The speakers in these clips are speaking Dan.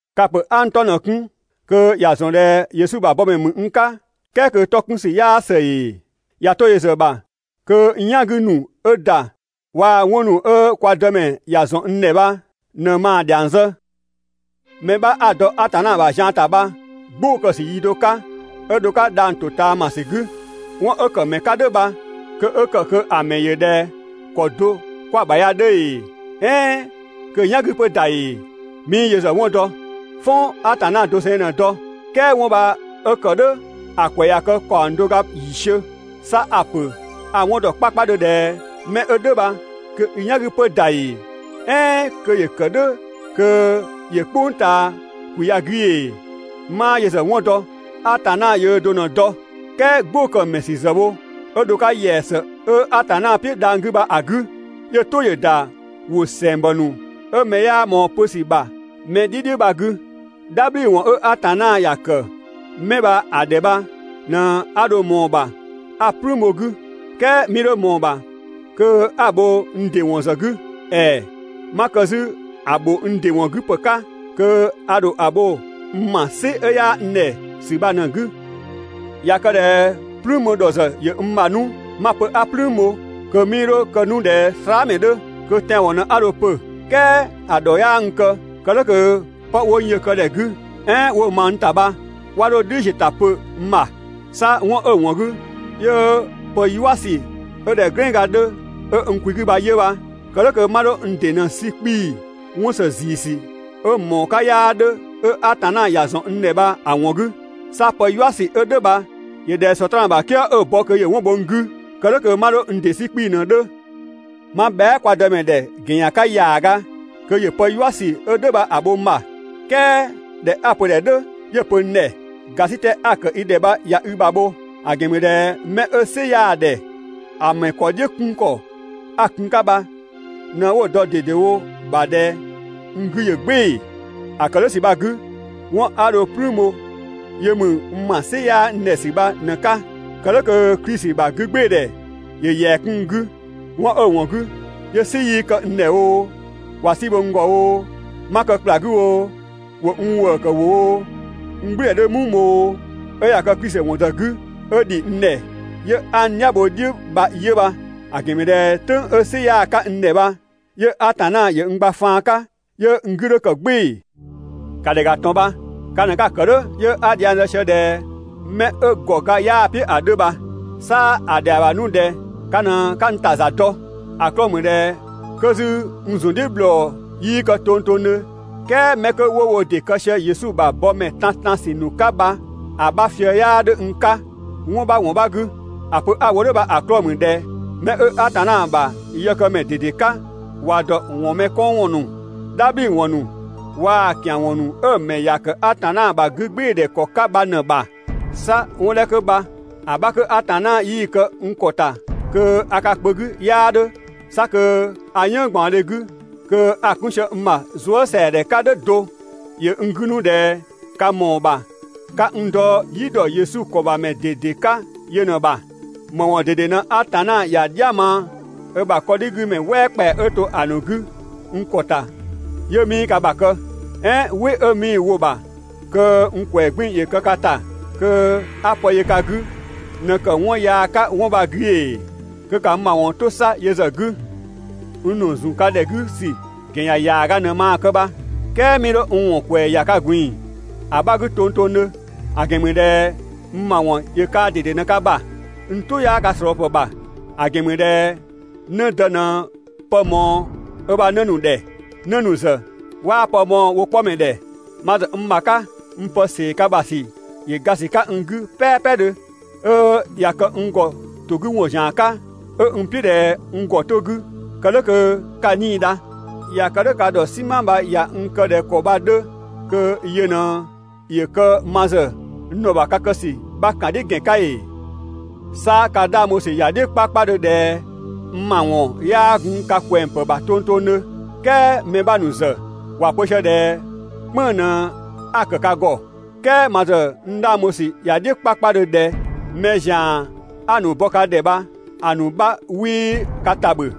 Ka‑ ‑pö 'a n 'tɔ ꞊në‑ 'kun (kö ‑ya ‑zɔn ꞊dhɛ Yesu ‑bha bɔmɛ ‑mü n 'ka) "kɛɛ kö 'tɔ 'kun ‑sü 'yaa ‑së ‑ee? ꞊Ya 'to yö ‑zë ‑bha, kö n "yan 'gü ‑nu 'ö ‑da waa‑ 'wɔn ‑nu 'ö kwa Dëmɛ ‑ya ‑zɔn n ‑dhɛ bha ꞊në maa‑ ‑dhiang zë. Mɛ 'bha 'a‑ dɔ Atanna ‑bha zian ‑ta bha "gbʋʋ‑ kë‑ ‑sü yi do 'ka 'ö dho‑ 'ka dhang‑ ‑to ꞊taamasü 'gü, 'wɔn 'ö ‑kë ‑mɛ 'ka "dhʋ̈ bha kö 'ö ‑kë kö‑ ‑mɛ ‑yö ꞊dhɛ ‑kɔ do 'kwa‑ ‑bha ya 'dhö ‑ee "ɛɛn kö‑ "yan 'gü 'pö ‑da ‑ee, 'mii yö ‑zë 'wɔn dɔ, "fɔn Atanna doseng ꞊në‑ dɔ. "Kɛɛ 'wɔn bha 'ö ‑kë "dhʋ̈ ‑a ‑kwɛ ꞊ya kë ‑kaɔng do ga ‑yiisiö. 'Sa a‑ ‑pö a‑ 'wɔn ‑dɔ 'kpakpadhö ꞊dhɛ mɛ 'ö "dhʋ̈ bha, (kö i "yan 'gü 'pö ‑da ‑ee, "ɛɛn kö ‑yö ‑kë "dhʋ̈ kö ‑yö "kpʋng ꞊taa ‑kwi ya‑ 'gü ‑ee, 'maa yö ‑zë 'wɔn ‑dɔ, Atanna yöö do ꞊në‑ dɔ,) "kɛɛ 'gbʋ‑ kë‑ ‑mɛ 'sü ‑zë ‑wo 'ö dho‑ 'ka ‑yɛa ‑së 'ö Atanna "piʋ̈ dhang‑ 'gü bha‑ 'gü, 'yö‑ "tʋ ‑yö ‑da ‑wʋ ‑sɛngbɔ ‑nu 'ö mɛ 'yaa ꞊mɔɔ‑ pö ‑sü ‑bha mɛ "dhi "dhiʋ̈, "dhabhliwɔn 'ö Atanna ‑ya ‑kë 'mɛ bha‑ ‑dhɛ bha ꞊në 'a dho ꞊mɔɔ‑ ‑bha 'a "plüün bho‑ 'gü, "kɛɛ 'mii 'dho ꞊mɔɔ‑ ‑bha kö 'a‑ bho n ‑dɩ ‑wɔn ‑zë 'gü. ‑Ɛɛ! 'Ma kë 'zü‑ ‑bho n ‑dɩ ‑wɔn 'gü ‑pë 'ka, kö a ‑dho ‑a bho n ‑ma "sɩ 'yaa n ‑dhɛ ‑sü bha ꞊në‑ 'gü. ꞊Ya kë ꞊dhɛ "plüün bho ‑dhɔ ‑zë ‑yö n ‑bha 'nu, 'ma‑ pö 'a "plüün bho, kö 'mii 'dho kë 'nu ꞊dhɛ slaamɛ 'dhö, kö tɛanwɔn ꞊në 'a dho‑ pö 'nu. "Kɛɛ ‑a ‑dhɔ 'yaa n kë, kë "dhʋ̈ kö 'pë 'wo n yö‑ kë ‑dhɛ 'gü, "ɛɛn 'wo‑ ma n ‑ta bha 'wa 'dho‑ "dhiʋ̈ ‑ziö ‑ta pö n ‑bha. 'Sa 'wɔn 'ö‑ ‑wɔn 'gü 'yö pë "yua ‑sü 'ö ꞊dhɛ "glɛnga 'dhö 'ö n kwi 'gü bha 'yö bha, kë "dhʋ̈ kö 'ma 'dho n ‑dɩ ꞊në 'sü 'kpii‑ 'wɔn ‑së ‑ziisü 'ö‑ ‑mɔɔ 'ka 'yaa 'dhö, 'ö Atanna ‑ya ‑zɔn n ‑dhɛ bha‑ ‑wɔn 'gü. 'Sa pë "yua ‑sü 'ö "dhʋ̈ bha ‑yö ꞊dhɛ Sɔtraan ‑bha "kië 'ö‑ bɔ kö ‑yö 'wɔn bho n 'gü, kë "dhʋ̈ kö 'ma 'dho n ‑dɩ 'sü 'kpii‑ ꞊në‑ 'dhö. 'Ma bhɛa" kwa Dëmɛ ‑dhɛ ‑gɛn ‑yan 'ka ‑yaaga kö ‑yö pë "yua ‑sü 'ö "dhʋ̈ bha‑ bho n ‑bha, "kɛɛ ꞊dhɛ 'a‑ pö‑ ‑dhɛ "dhʋ̈ 'yö‑ pö n ‑dhɛ «‑Gasitɛ 'a‑ ‑kë i ‑dhɛ bha ꞊ya i ‑bha bho, ‑a ‑gɛn ‑mü ꞊dhɛ 'mɛ 'ö "sɩ 'yaa‑ ‑dhɛ ‑a ‑mɛ ‑kɔ "dhiʋ̈ 'kun ‑kɔ 'a‑ kun‑ 'ka bha ꞊në 'wo‑ dɔ ꞊dedewo ‑bha ꞊dhɛ n 'gü ‑yö "gbɩɩ‑.» ‑A ‑kë "dhʋ̈ ‑sü bha‑ 'gü, 'wɔn 'a dho‑ "plüün bho 'yö ‑mü n ‑ma "sɩ 'yaa n ‑dhɛ ‑sü bha ꞊në‑ 'ka, kë "dhʋ̈ kö Klisi ‑bha 'gügbɩɩdhɛ ‑yö ‑yɛa 'kun n 'gü. 'Wɔn 'ö‑ ‑wɔn 'gü 'yö "sɩ 'yii kë n ‑dhɛ oo, ꞊wa "si bho n ‑gɔ oo, 'ma kë ‑kpla 'gü oo, 'wo n ‑wëëkë wo oo, n "gblüdhɛ 'dhö "muu bho oo, 'ö ꞊ya kë Klisi ‑wɔn ‑zë 'gü 'ö ‑dhi n ‑dhɛ 'yö 'a n "dhia bho‑ "dhiʋ̈ bha 'yö bha. ‑A ‑gɛn ‑mü ꞊dhɛ "tʋ̈ng 'ö "sɩ 'yaa 'ka n ‑dhɛ bha 'yö Atanna ‑yö n gba faan 'ka 'yö n 'gü 'dhö ‑kë "gbɩɩ‑. ‑Ka ‑dhɛ ‑ga ꞊tɔn bha, ka ꞊në 'ka‑ ‑kë "dhʋ̈ 'yö 'a dhiang zë sië ꞊dhɛ 'mɛ 'ö ‑gɔ ga 'yaa‑ "piʋ̈ ‑a 'dhö bha. 'Sa ‑a ‑dhɛa ‑bha 'nu ꞊dhɛ ka ꞊në 'ka n ‑ta ‑za dɔ. ‑A 'klɔɔ‑ ‑mü ꞊dhɛ 'kö 'zü n ‑zun "dhiʋ̈ ‑bhlɔ 'yii kë tongtongdhö, "kɛɛ mɛ 'kö 'wo wo ‑dɩ kë sië Yesu ‑bha bɔmɛ tantansü ‑nu 'ka bha‑ 'bha fië‑ 'yaa 'dhö n 'ka 'wɔn 'bha ‑wɔn 'bha 'gü. ‑A pö 'a‑ wo "dhʋ̈ bha‑ 'klɔɔ‑ ‑mü ꞊dhɛ 'mɛ 'ö Atanna ‑bha yëkëmɛ ꞊dede 'ka, ‑wa ‑dɔ ‑wɔn mɛ 'kɔn ‑wɔn ‑nu, "dhabhliwɔn ‑nu, waa‑ ‑kianwɔn ‑nu 'ö‑ ‑mɛ ‑ya ‑kë Atanna ‑bha 'gügbɩɩdhɛ ‑kɔ 'ka bha ꞊në‑ ‑bha. 'Sa 'wɔn 'dhɛ 'kö bha‑ 'bha 'kö Atanna 'yii‑ kë n ‑kɔ ‑ta kö a ka kpö 'gü 'yaa 'dhö, 'sa kö a "yënng ꞊gbaɔndhe 'gü, kö a‑ 'kun sië n ‑bha zuësɛadhɛ 'ka "dhʋ̈ do. ‑Yö n 'gü 'nu ꞊dhɛ ka ‑mɔɔ ‑bha 'ka n dɔ "yi ‑dɔ Yesu ‑kɔ ‑bha ‑mɛ ꞊dede 'ka yö ꞊në‑ ‑bha. ‑Më ‑wɔn ꞊dede 'pö Atanna ‑ya "dhia ma ö ‑bha mɛ "wɛɛ ‑kpɛa 'ö to‑ ‑nu 'gü n ‑kɔ ‑ta 'yö 'mii ka ‑bha kë? "Ɛɛn 'wɩ 'ö 'mii‑ wo‑ ‑bha kö n ‑kwɛɛ 'gbiin‑ ‑yö kë ka ‑ta (kö 'a pë yö ka 'gü) ꞊në ‑kë 'wɔn yaa 'ka 'wɔn bha‑ 'gü ‑ee? Kö ‑ka n ‑ma ‑wɔn 'to 'sa yö ‑zë 'gü. N ‑nu zun ka ‑dhɛ 'gü ‑sü ‑gɛn ‑yan ‑yaaga ‑naa ꞊në maa nu‑ 'ka bha, "kɛɛ 'mii 'dho n ‑wɔn ‑kwɛɛ ‑ya ka ꞊gbin‑ ‑a 'bha 'gü tongtongdhö, ‑a ‑gɛn ‑mü ꞊dhɛ n ‑ma ‑wɔn ‑yö kaa ꞊dede ꞊në ka ‑bha, n "tʋ 'yaa ka ꞊slɔɔpë ‑bha. ‑A ‑gɛn ‑mü ꞊dhɛ 'në dë ꞊në pë ꞊mɔɔ ö ‑bha 'në ‑nu ‑dhɛ, 'në ‑nu ‑zë 'waa pë mɔɔ‑ wo 'kpɔmɛ ‑dhɛ. Ma ‑zë n ‑bha 'ka, n pë ‑see ka ‑bha ‑sü ‑yö ga ‑sü 'ka n 'gü "pɛɛpɛdhö, 'ö ꞊ya kë n ‑gɔ ‑to 'gü ‑wɔn ‑zian 'ka, 'ö n "piʋ̈ ꞊dhɛ n ‑gɔ 'to‑ 'gü kë "dhʋ̈ kö ka 'nii‑ dha. ꞊Ya kë "dhʋ̈, ka ‑dhɔ "sima bha ꞊ya n kë ꞊dhɛ ‑kɔ bha‑ 'dhö kö yö ꞊në ‑yö kë ma ‑zë n ‑dhɔ ‑bha ka kë ‑sü 'bha ‑kan "dhiʋ̈ ‑gɛn 'ka ‑ee? 'Sa ka 'dhang bho ‑sü ‑ya "dhiʋ̈ 'kpakpadhö ꞊dhɛ n ‑mawɔn 'yaa gun ka kwɛng ‑pë ‑bha tongtongdhö, "kɛɛ mɛ 'bha ‑nu ‑zë ‑wa pö sië ꞊dhɛ "kpënng‑ ꞊në 'a‑ ‑kë ka ‑gɔ. "Kɛɛ ma ‑zë n 'dhang bho ‑sü ‑ya "dhiʋ̈ 'kpakpadhö ꞊dhɛ, mɛ ‑zian 'a‑ ‑nu bɔ ka ‑dhɛ bha‑ ‑nu 'bha 'wii ka ‑ta ‑bhö.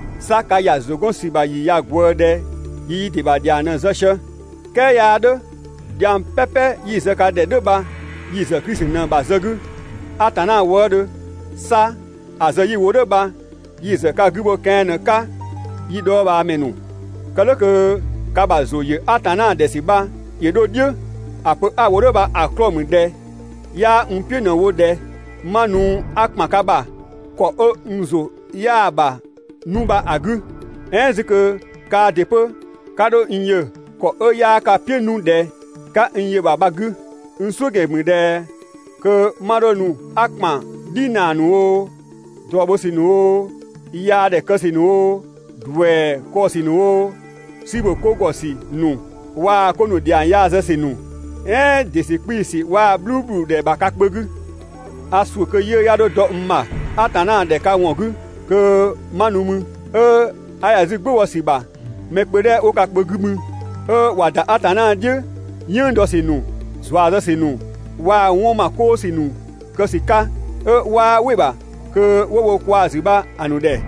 'Sa ka ‑ya ‑zʋ 'gɔn ‑sü ‑bha ‑yi ꞊ya ꞊gwëë ꞊dhɛ yi yi ‑dɩ ‑bha ‑dhiang ꞊në‑ zë sië. "Kɛɛ 'yaa "dhʋ̈. Dhiang "pɛpɛ 'yi‑ zë ka ‑dhɛ "dhʋ̈ bha yi‑ ‑zë Klisi ꞊në‑ ‑bha zë 'gü, Atanna wëëdhö. 'Sa ‑a zë 'yi‑ wo "dhʋ̈ bha, 'yi‑ ‑zë ka 'gü bho kɛan ꞊në‑ 'ka yi dhɔɔbhaamɛ ‑nu, kë "dhʋ̈ kö ka ‑bha ‑zʋ ‑yö Atanna ‑dhɛ ‑sü bha ‑yö 'dho "dhiʋ̈. ‑A pö 'a‑ wo "dhʋ̈ bha‑ 'klɔɔ‑ ‑mü ꞊dhɛ 'yaa n "piʋ̈ ꞊në‑ wo ꞊dhɛ 'ma nu 'a ‑kpan ka ‑bha ‑kɔ 'ö n ‑zʋ 'yaa‑ ‑bha 'nu bha‑ 'gü, "ɛɛn 'zü kö kaa ‑dɩ 'pö 'ka 'dho n yö ‑kɔ 'ö 'yaa ka "piʋ̈ 'nu ꞊dhɛ 'ka n yö‑ ‑bha bha‑ 'gü. N "suʋ̈ ‑gɛn ‑mü ꞊dhɛ kö 'ma 'dho nu 'a ‑kpan "dhinaa ‑nu oo, ꞊drɔ bho ‑sü ‑nu oo, yaa ‑dhɛ kë ‑sü ‑nu oo, ‑duɛ kɔɔ‑ ‑sü ‑nu oo, "si ‑bho 'ko ‑gɔ ‑sü ‑nu waa‑ 'ko ‑nu ‑dhiang yaa zë ‑sü ‑nu, "ɛɛn ‑dɩ ‑sü 'kpii‑ ‑sü waa‑ "bhluubhludhɛ ‑bha ka kpö 'gü. A ‑suʋ̈ kö 'yiʋ̈‑ 'ya 'dho dɔ n ‑bha Atanna ‑dhɛ ka ‑wɔn 'gü kö 'ma nu mü, 'ö 'a ‑ya 'zü "gbʋ bɔ ‑sü ‑bha mɛ kpö 'dhɛ 'wo ka kpö 'gü mü 'ö ꞊wa ‑da Atanna "dhiʋ̈, "yënng dɔ ‑sü ‑nu, ‑zua zë ‑sü ‑nu, waa‑ 'wɔn ‑ma 'koo ‑sü ‑nu kë ‑sü 'ka, 'ö 'waa "wɩ‑ ‑bha kö ‑wo wo kwa‑ ‑zü bha‑ ‑nu ‑dhɛ.